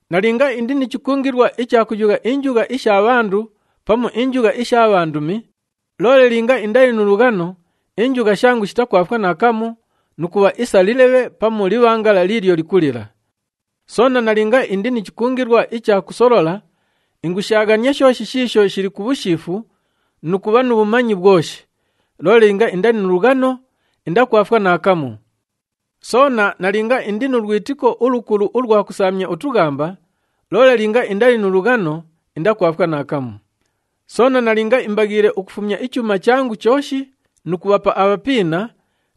Nalinga indi ni chikungilwa icha kuyugha injugha isha bhandu pamu injugha isha bhandumi, loole linga indali nu lughano, injugha shangu shitakwafwa naakamu nu kubha isa lilebhe pamu libhangala liilyo likulila. Soona nalinga indi ni chikungilwa icha kusolola, ingushaaghania shooshi shiisho shili ku bhushiifu nu kubha nu bhumanyi bhwoshi, loole linga indali nu lughano, indakwafwa naakamu. Soona nalinga indi nu lwitiko ulukulu ulwa kusaamya utughamba, loole linga indali nu lughano, indakwafwa naakamu. Soona nalinga imbaghiile ukufumya ichuuma changu chooshi nu kubhapa abhapiina,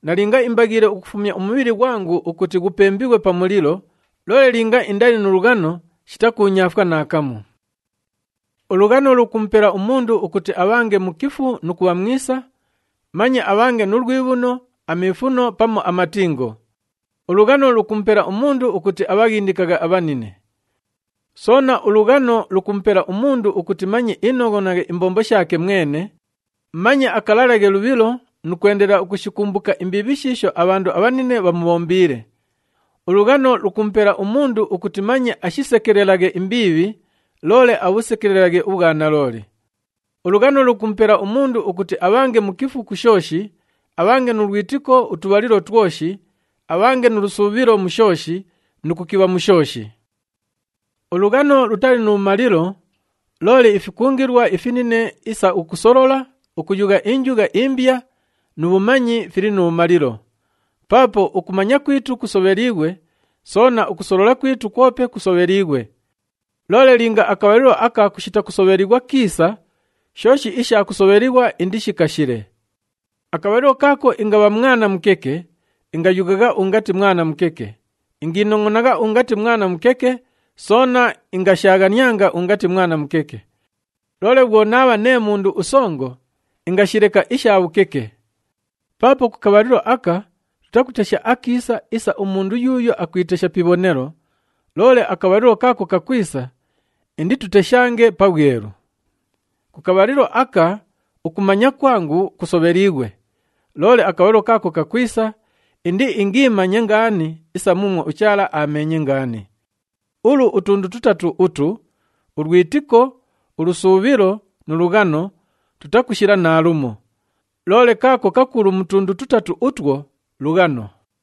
nalinga imbaghiile ukufumya umubhili ghwangu ukuti ghupembighwe pa mulilo, loole linga indali nu lughano, shitakuunyaafwa naakamu. Ulughano lukumupela umundu ukuti abhange mukifu nu kubha mwisa, manye abhange nu lwibhuno, amiifuno pamu amatingo. Ulughano lukumupela umundu ukuti abhaghindikaghe abhanine. Soona, ulughano lukumupela umundu ukuti manye inongʼonaghe imbombo shaake mwene, manye akalalaghe lubhilo nu kwendelela ukushikumbuka imbiibhi shiisho abhandu abhanine bhamubhombiile. Ulughano lukumupela umundu ukuti manye ashisekelelaghe imbiibhi, loole abhusekelelaghe ubhwanalooli. Ulughano lukumupela umundu ukuti abhange mukifu ku shooshi, abhange nu lwitiko utubhalilo twoshi, abhange nu lusuubhilo mu shooshi nu kukibha mu shooshi. Ulughano lutali nu bhumalilo, loole ifikungilwa ifinine isa ukusolola, ukuyugha injugha imbya nu bhumanyi fili nu bhumalilo. Paapo ukumanya kwitu kusobheliighwe, soona ukusolola kwitu kwope kusobheliighwe. Loole linga akabhalilo aka kushita kusobhelighwa kiisa, shooshi isha kusobhelighwa indishikashile. Akabhalilo kaako ingabha mwana mukeke, ingayughagha ungati mwana mukeke, ingiinongʼonagha ungati mwana mukeke, soona ingashaaghanianga ungati mwana mukeke. Loole bhwo naabha nee mundu usongo, ingashileka isha bhukeke. Paapo ku kabhalilo aka, tutakutesha akiisa isa umundu yuuyo akwitesha pi ibhonelo, loole akabhalilo kaako kakwisa, indituteshange pabhwelu. Ku kabhalilo aka ukumanya kwangu kusobheliighwe, loole akabhalilo kaako kakwisa, indiingamanye ngaani isa muumwo uChaala aameenye ngaani. Ulu utundu tutatu utu, ulwitiko, ulusuubhilo nu lughano tutakushila naalumo. Loole kaako kakulu mu tundu tutatu utwo lughano.